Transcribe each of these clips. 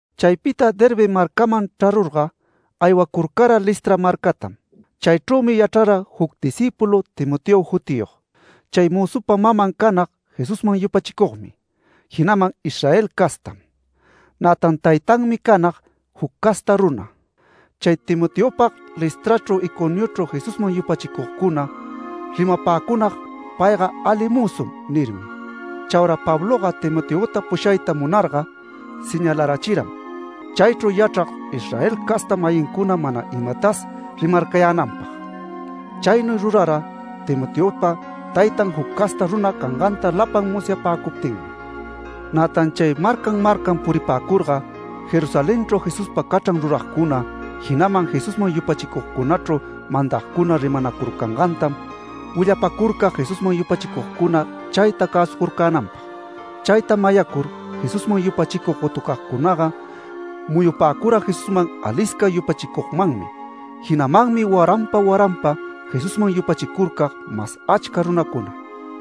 Chaypita Derbe marcaman chrarurga aywacurcara Listra marcatam. Chaychrümi yachrara juc discípulu Timoteo jutiyog. Chay mözupa maman canag Jesusman yupachicugmi, jinaman Israel castam. Nätan taytanmi canag juc casta runa. Chay Timoteopag Listrachru Iconiochru Jesusman yupachicugcuna rimapäcunag: “Payga ali mözum” nirmi. Chaura Pabloga Timoteota pushayta munarga señalarachiram, chaychru yachrag Israel casta-mayincuna mana imatas rimarcayänanpag. Chaynuy rurara Timoteopa taytan juc casta runa canganta lapan musyapäcuptinmi. Nätan chay marcan marcan puripäcurga, Jerusalenchru Jesuspa cachran ruragcuna, jinaman Jesusman yupachicugcunachru mandagcuna rimanacurcangantam willapacurcag Jesusman yupachicugcuna chayta cäsucurcänanpag. Chayta mayacur Jesusman yupachicug gotucagcunaga muyupäcura Jesusman alisca yupachicugmanmi. Jinamanmi waranpa, waranpa Jesusman yupachicurcag mas achca runacuna.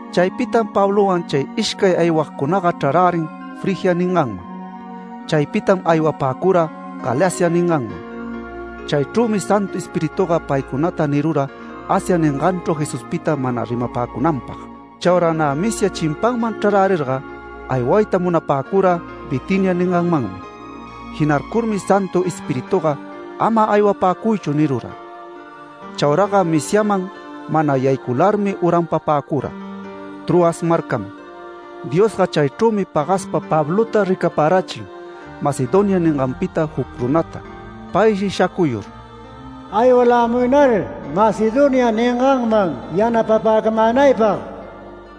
Chaypitam Pablowan chay ishcay aywagcunaga chrarärin Frigia ninganman. Chaypitam aywapäcura Galacia ninganman. Chaychrümi Santu Espirituga paycunata nirura Asia ninganchru Jesuspita mana rimapäcunanpag. Chaura nä Misia chimpanman chrarärirga aywayta munapäcura Bitinia ninganmanmi. Jinarcurmi Santu Espirituga “Ama aywapäcuychu” nirura. Chauraga Misiaman mana yaycularmi uranpapäcura Troas marcaman. Diosga chaychrümi pagaspa Pablota ricaparachin, Macedonia ninganpita juc runata. Payshi shacuyur “Aywalämuynar Macedonia ninganman yanapapäcamänaypag”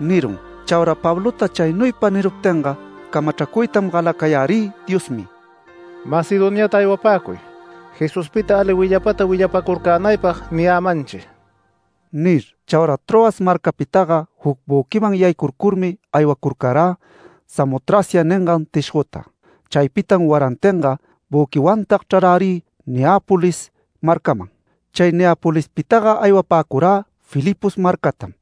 nirun. Chaura Pablota chaynuypa niruptinga, camachracuytam galacayärï Diosmi “Macedoniata aywapäcuy Jesuspita ali willapata willapacurcänaypag niyämanchi” nir. Chaura Troas marcapitaga juc büquiman yaycurcurmi aywacurcarä Samotracia ningan tishgota. Chaypitam warantinga büquiwantag chrarärï Neápolis marcaman. Chay Neapolispitaga aywapäcurä Filipos marcatam.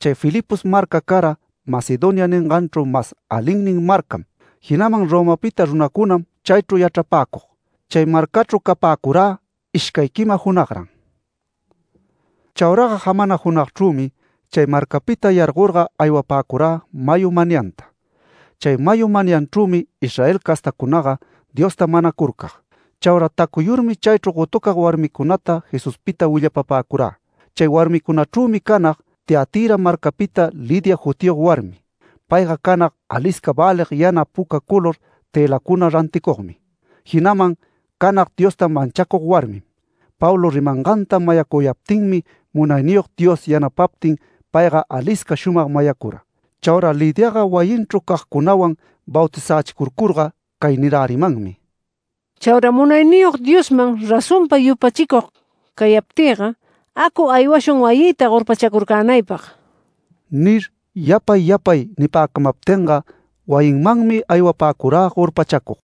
Chay Filipos marca cara Macedonia ninganchru mas alinnin marcam. Jinaman Romapita runacunam chaychru yachrapäcug. Chay marcachru capäcurä ishcay quima junagran. Chauraga jamana junagchrümi, chay marcapita yargorga aywapäcurä mayu manyanta. Chay mayu manyanchrümi Israel castacunaga Diosta manacurcag. Chaura tacuyurmi chaychru gotucag warmicunata Jesuspita willapapäcurä. Chay warmicunachrümi canag Tiatira marcapita Lidia jutiyog warmi. Payga canag alisca välig yana puca color tëlacuna ranticugmi, jinaman canag Diosta manchacug warmim. Pablo rimanganta mayacuyaptinmi Munayniyog Dios yanapaptin payga alisca shumag mayacura. Chaura Lidiaga wayinchru cagcunawan bautizächicurcurga cay nirärimanmi: “Chaura Munayniyog Diosman razonpa yupachicug cayaptïga, acu aywashun wayïta gorpachacurcänaypag” nir, yapay yapay nipäcamaptinga wayinmanmi aywapäcurä gorpachacug.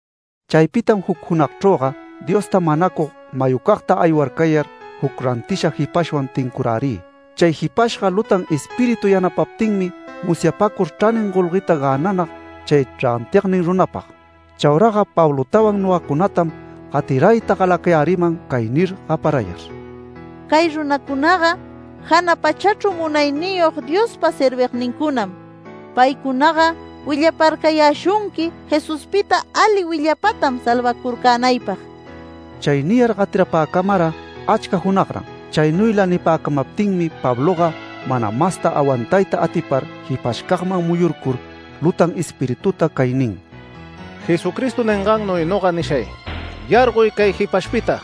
Chaypitam juc junagchrüga Diosta manacug mayucagta aywarcayar, juc rantisha jipashwan tincurärï. Chay jipashga lutan espíritu yanapaptinmi musyapacur chranin golgueta gänanag chay rantignin runapag. Chauraga Pablotawan nogacunatam gatirayta galacayäriman cay nir gaparayar: “Cay runacunaga jana pachachru Munayniyog Diospa servignincunam. Paycunaga willaparcayäshunqui Jesuspita ali willapatam salvacurcänaypag”. Chay niyar gatirapäcamara achca junagran. Chaynuyla nipäcamaptinmi Pabloga, mana masta awantayta atipar jipashcagman muyurcur lutan espirituta cay nin: “Jesucristo ningannuy noga nishay: ¡Yargoy cay jipashpita!”.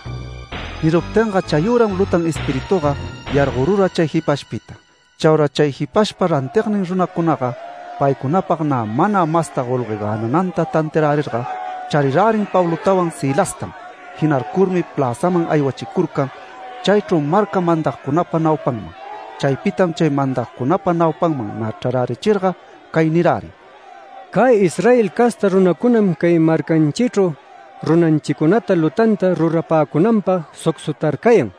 Niruptinga chayüram lutan espirituga yargorura chay jipashpita. Chaura chay jipashpa rantignin runacunaga paycunapag nä mana masta golgue gänananta tantiarärirga, charirärin Pablotawan Silastam. Jinarcurmi pläzaman aywachicurcan, chaychru marca mandagcunapa naupanman. Chaypitam chay mandagcunapa naupanman nä chrarärichirga cay nirärin: “Cay Israel casta runacunam cay marcanchichru runanchicunata lutanta rurapäcunanpag sucsutarcayan.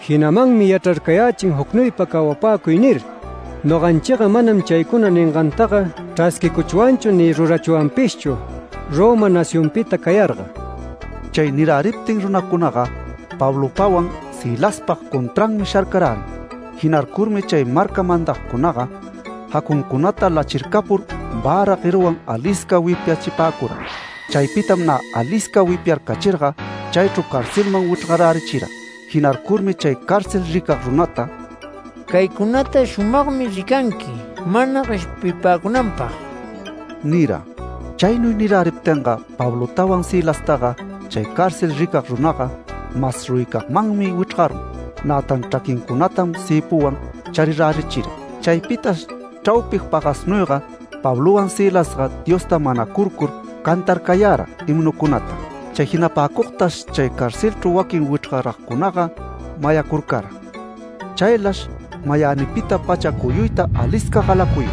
Jinamanmi yachrarcayächin ‘Jucnuypa cawapäcuy’ nir. Noganchiga manam chaycuna ningantaga chrasquicuchwanchu ni rurachwanpishchu Roma nacionpita cayarga”. Chay niräriptin runacunaga Pablopawan Silaspag contranmi sharcarärin. Jinarcurmi chay marca mandagcunaga, jacuncunata lachircapur vära gueruwan alisca wipyachipäcura. Chaypitam nä alisca wipyarcachirga chaychru carcelman wichrgarärichira. Jinarcurmi chay cárcel ricag runata “Caycunata shumagmi ricanqui mana gueshpipäcunanpag” nira. Chaynuy niräriptinga Pablotawan Silastaga chay cárcel ricag runaga, mas ruyicagmanmi wichrgarun. Nätan chraquincunatam cëpuwan charirärichira. Chaypitash chraupi pagasnuyga Pablowan Silasga Diosta manacurcur cantarcayara himnucunata. Chay jinapäcugtash chay carcelchru waquin wichrgaragcunaga mayacurcara. Chaylash mayänipita pacha cuyuyta alisca galacuyun,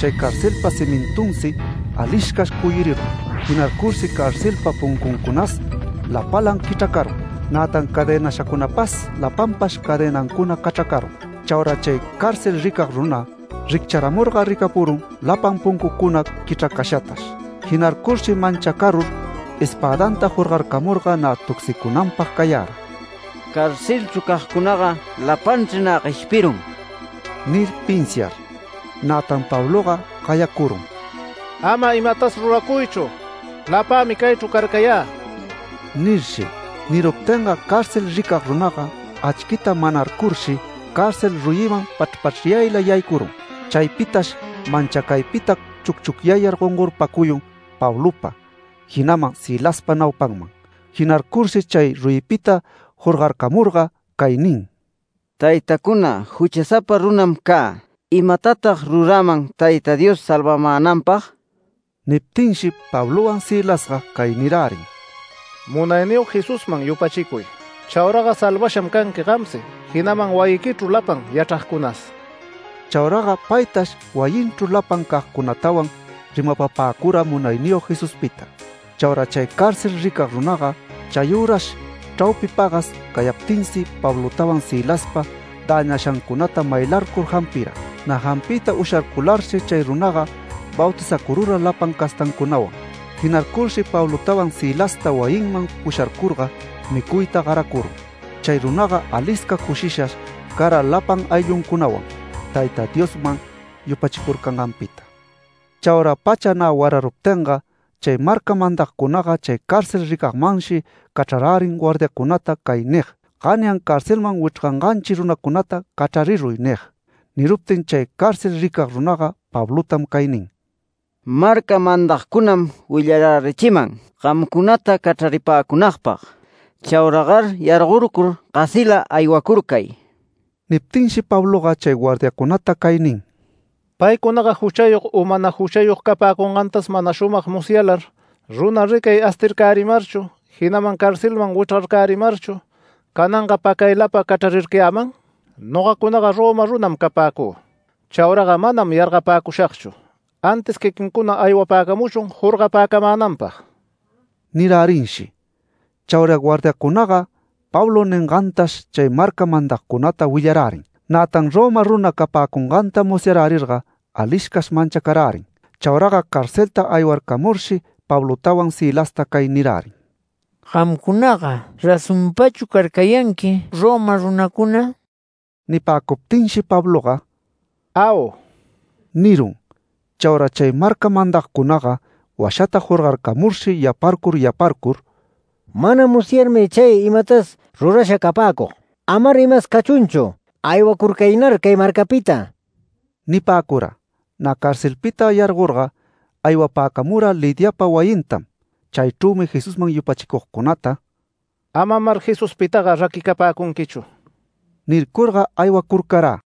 chay carcelpa cimintunsi aliscash cuyuricun. Jinarcurshi carcelpa puncuncunas lapalan quichracarun. Nätan cadenashacunapas lapanpash cadenancuna cachracarun. Chaura chay cárcel ricag runa riccharamurga ricapurun lapan puncucuna quichracashatash. Jinarcurshi manchacarur espädanta jorgarcamurga nä tucsicunanpag cayara “Carcelchru cagcunaga lapanchri nä gueshpirun” nir pinsiar. Nätan Pabloga gayacurun: “Ama imatas ruracuychu. Lapämi caychru carcayä” nirshi. Niruptinga cárcel ricag runaga achquita manarcurshi, cárcel ruyiman pachrpachryayla yaycurun. Chaypitash manchacaypita chucchucyayar gongorpacuyun Pablopa, jinaman Silaspa naupanman Jinarcurshi chay ruyipita jorgarcamurga cay nin: “Taytacuna, juchasapa runam cä. ¿Imatatag ruräman Tayta Dios salvamänanpag?” Niptinshi Pablowan Silasga cay nirärin: “Munayniyog Jesusman yupachicuy. Chauraga salvasham canqui gamsi, jinaman wayiquichru lapan yachragcunas”. Chauraga paytash, wayinchru lapan cagcunatawan rimapapäcura Munayniyog Jesuspita. Chaura chay cárcel ricag runaga chayürash chraupi pagas cayaptinsi Pablopawan Silaspa däñashancunata maylarcur jampira. Nä jampiyta usharcularshi chay runaga bautizacurura lapan castancunawan. Jinarcurshi Pablotawan Silasta wayinman pusharcurga micuyta garacurun. Chay runaga alisca cushishash cara lapan aylluncunawan Tayta Diosman yupachicurcanganpita. Chaura pacha nä wararuptinga chay marca mandagcunaga chay cárcel ricagmanshi cachrarärin guardiancunata cay nig: “Ganyan carcelman wichrganganchi runacunata cachrariruy” nig. Niruptin chay cárcel ricag runaga Pablotam cay nin: “Marca mandagcunam willarärichiman gamcunata cachraripäcunagpag. Chauragar yargorcur gasila aywacurcay”. Niptinshi Pabloga chay guardiacunata cay nin: “¿Paycunaga juchayog u mana juchayog capäcungätas mana shumag musyalar, runa ricay astircärimarchu, jinaman carcelman wichrgarcärimarchu cananga pacaylapa cachrarircayäman? Nogacunaga Roma runam capäcü. Chauraga manash yargapäcushagchu, antis quiquincuna aywapäcamuchun jorgapäcamänanpag” nirärinshi. Chaura guardiacunaga Pablo ningantash chay marca mandagcunata willarärin. Nätan Roma runa capäcunganta musyarärirga aliscash manchacarärin. Chauraga carcelta aywarcamurshi Pablotawan Silasta cay nirärin: “¿Gamcunaga razonpachu carcayanqui Roma runacuna?” Nipäcuptinshi Pabloga “Au” nirun. Chaura chay marca mandagcunaga washata jorgarcamurshi yaparcur yaparcur “Mana musyarmi chay imatas rurasha capäcug. Amar imas cachunchu. Aywacurcaynar cay marcapita” nipäcura. Nä carcelpita yargorga aywapäcamura Lidiapa wayintam. Chaychrümi Jesusman yupachicugcunata “Amamar Jesuspitaga raquicapäcunquichu” nircurga aywacurcarä.